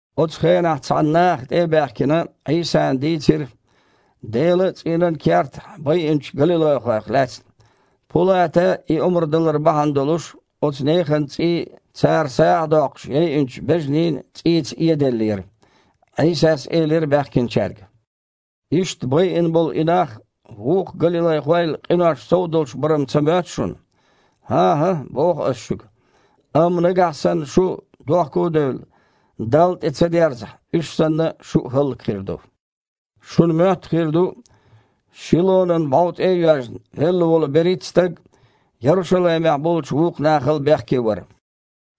Оцу хенахь цхьана наха, тІе а баьхкина, Іийсана дийцира Делан цІийнан кертахь байинчу галилайхойх лаьцна. Пулата и омра далар бахьана долуш, оцу нехан цІий цара сагІа доккхуш яйинчу бежанийн цІийца эделлера. Іийсас элира баьхкинчаьрга: «Иштта байина болу и нах вукху галилайхойл къинош сов долуш бара-м ца моьтту шуна? ХІан-хІа, – боху Ас шуьга, – амма нагахь санна шу, дохко а девлла, Далла тІе ца дерзахь, уьш санна, шу а хІаллакьхир ду. Шуна моьтту хир ду, Шилонан бІов тІе а йоьжна, велла волу берхІитта стаг Ярушалаймехь болчу вукху нахал бехке вара?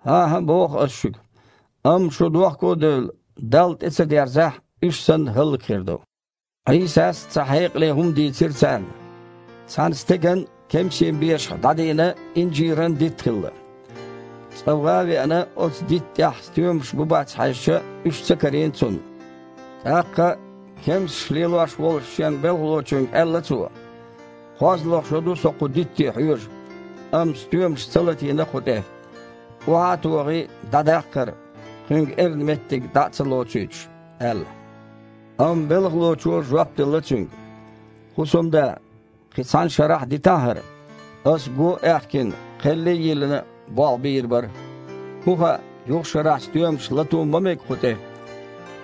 ХІан-хІа, – боху Ас шуьга, – амма шу, дохко а девлла, Далла тІе ца дерзахь, уьш санна хІаллакьхир ду». Іийсас цхьа хьекъале хІума дийцира царна: «Цхьана стеган кемсийн бешахь дІадийна инжиран дитт хилла. Цкъа, ван а веана, оцу дитта тІехь стоьмаш бу бац хьаьжча, уьш ца карийна цунна. ТІаккха кемсаш лелош волчу шен белхалочуьнга аьлла цо: „КхозлагІа шо ду со кху дитте хьоьжу, амма стоьмаш ца латийна кху тІе. Охьа а тохий, дІадаккха хІара, кхуьнга эрна меттиг дІа а ца лоцуьйтуш“, – аьлла. Амма белхалочо жоп делла цуьнга: „ХІусамда! Кхин цхьана шарахь а дитахьа хІара. Ас, го а аьхкина, кхелли а йиллина, болх бийр бара. ХІун хаьа, юха шарахь стоьмаш лато а ма мега кху тІе?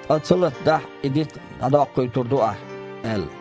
Ткъа ца латадахь, и дитт дІадоккхуьйтур ду ахь“, – аьлла».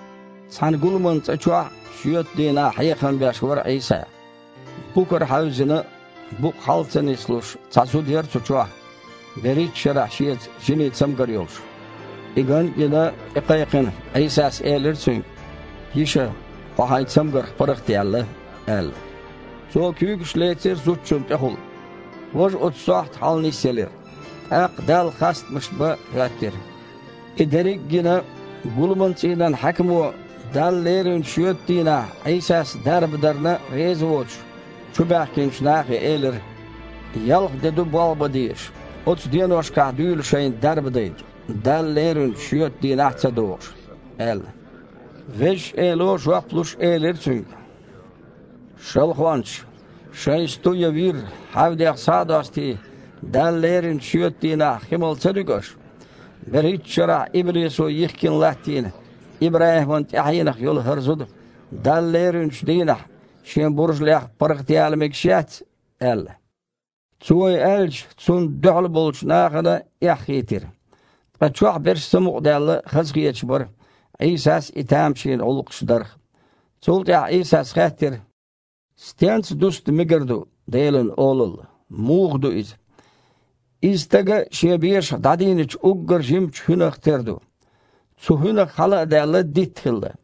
Цхьана гуламан цІа чохь шоьтан дийнахь хьехам беш вара Іийса. Букара хьаьвзина, букъ хьала ца нислуш, цхьа зуда яра цу чохь, берхІитта шарахь шеца жинийн цамгар йолуш. И ган а гина, тІекхайкхина, Іийсас элира цуьнга: «Йиша! Хьо хьайн цамгарх паргІатъяьлла», – аьлла. Цо куьйгаш лецира зудчунна тІехула. Важа оцу сохьта хьаланисъелира, тІаккха Далла хастамаш бан хІоьттира. И дерриг гина, гуламан цІийнан хьаькамо, Далла леринчу шоьтан дийнахь Іийсас дарба дарна реза воцуш, чубаьхкинчу нахе элира: «Ялх де ду болх бан дезаш. Оцу деношкахь дуьйла шайна дарба дайта, Далла леринчу шоьтан дийнахь а ца догІуш», – аьлла. Везачу Эло, жоп луш, элира цуьнга: «Шалхончаш! Шайн сту я вир, хьаьвдех схьа а достий, Далла леринчу шоьтан дийнахь хи мала ца дуьгу аш? БерхІитта шарахь иблисо йихкина латтийна ИбрахІиман тІаьхьенах йолу хІара зуда Далла леринчу дийнахь шен буржалех паргІатъяла мегаш яц?» – аьлла. Цо и аьлча, Цунна дуьхьалболчу нахана эхь хийтира. Ткъа чохь берш самукъадаьлла, хазахеташ бара Іийсас и тамашийна гІуллакхаш дарх. Цул тІаьхьа Іийсас хаьттира: «Стенца дуста мегар ду Делан Олалла? Муха ду иза? Иза стага шен бешахь дІадийначу уггар жимачу хІуьнах тера ду. Цу хІуьнах, хьала а даьлла, дитт хилла.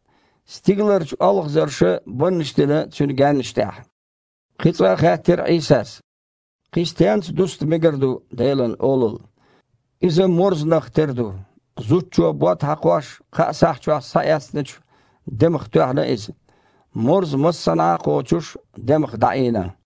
Стигаларчу олхазарша баннаш дина цуьнан гаьннаш тІехь». Кхин цкъа а хаьттира Іийсас: «Кхин стенца дуста мегар ду Делан Олалла? Иза морзанах тера ду. Зудчо, бод хьакхош, кхаа сахь чохь схьаэцначу демах тоьхна иза. Морза, массанхьа а кхочуш, демах дІаийна».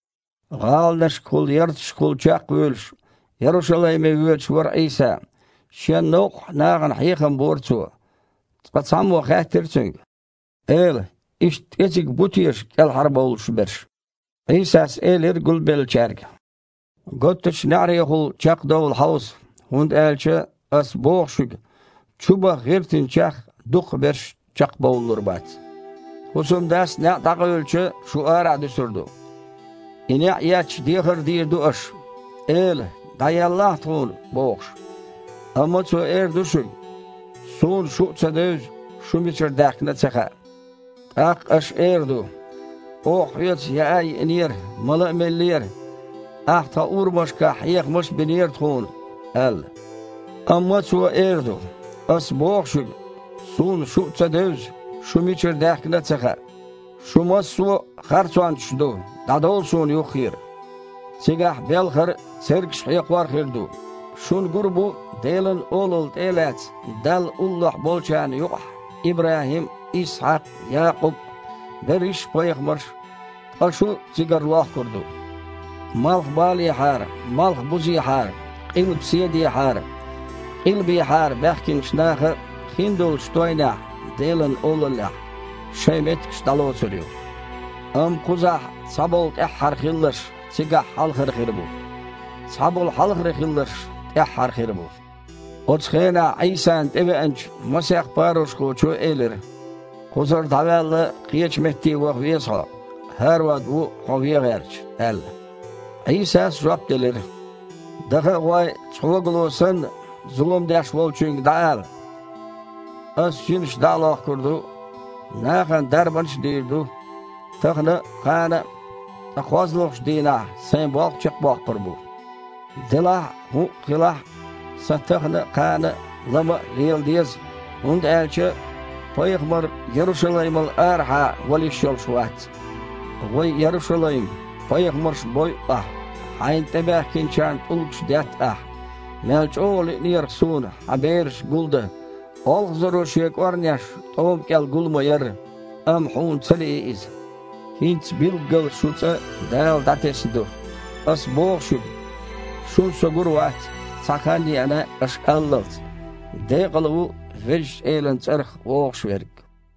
ГІаланашкахула, ярташкахула чекхвуьйлуш, Ярушалайме воьдуш вара Іийса. Шен новкъахь нахана хьехам бора Цо. Цкъа цхьаммо хаьттира Цуьнга: «Эла! Иштта кІезиг бу теша кІелхьарбовлуш берш?» Іийсас элира гулбеллачаьрга: «Готтачу неІарехула чекхдовла хьовса, хІунда аьлча, Ас боху шуьга чубаха гІиртинчех, дукхахберш чекхбовлалур бац. ХІусамдас неІ дІакъевлича, шу арахь дуьсур ду. И неІ етташ, дехар дийр ду аш: „Эла! ДІаеллахьа тхуна“, – бохуш. Амма Цо эр ду шуьга: „Суна шу а ца девза, шу мичара даьхкина а ца хаьа“. ТІаккха аш эр ду: „Оха Хьоьца яа а йиинера, мала а меллера, Ахь тхан урамашкахь хьехамаш а бинера тхуна“, – аьлла. Амма Цо эр ду: „Ас боху шуьга, Суна шу а ца девза, шу мичара даьхкина а ца хаьа. Шу массо а харцончаш ду, дІадовла Суна юххера!“ Цигахь белхар а, цергаш хьекхор а хир ду. Шуна гур бу Делан Олалла тІе а лаьцна, Далла уллохь болчарна юкъахь ИбрахІим а, Исхьакх а, Якъуб а, берриш пайхамарш а, ткъа шу цигара лохкур ду. Малхбалехьара, малхбузехьара, къилбаседехьара, къилбехьара баьхкинчу наха хиндолчу тойнехь, Делан Олаллехь, шайн меттигаш дІалоцур ю. Амма кхузахь цхьаболу тІаьххьара хилларш цигахь хьалхара хир бу, цхьаболу хьалхара хилларш тІаьххьара хир бу». Оцу хенахь Іийсана тІевеанчу масех парушхочо элира: «Кхузара дІаваьлла, кхечу метте ваха веза Хьо – ХІарод ву Хьо вен гІерташ», – аьлла. Іийсас жоп делира: «Даха а гІой, цхьогало санна, зулам деш волчуьнга дІаала: „Ас жинаш дІа а лохкур ду, нахана дарбанаш а дийр ду тахана а, кхана а, ткъа кхозлагІчу дийнахь Сайн болх чекхбоккхур бу“. Делахь а, хІуъа хилахь а, Сан тахана а, кхана а, лама а лела деза, хІунда аьлча пайхамар Ярушалаймал арахьа вала йиш йолуш вац. Ва Ярушалайм! Пайхамарш бойу ахь, хьайна тІебахкийтиначарна тІулгаш детта ахь. Мел чІогІа лиънера-кх Суна хьан бераш гулдан, олхазаро шен кІорнеш тІома кІел гул ма-ярра, амма хьуна ца лии иза. ХІинца билггала шун ЦІа Дала дІатесна ду. Ас боху шуьга, шуна Со гур вац, цхьа хан а еана, аш аллалц: „Декъала ву Везачу Элан цІарах вогІуш верг!“»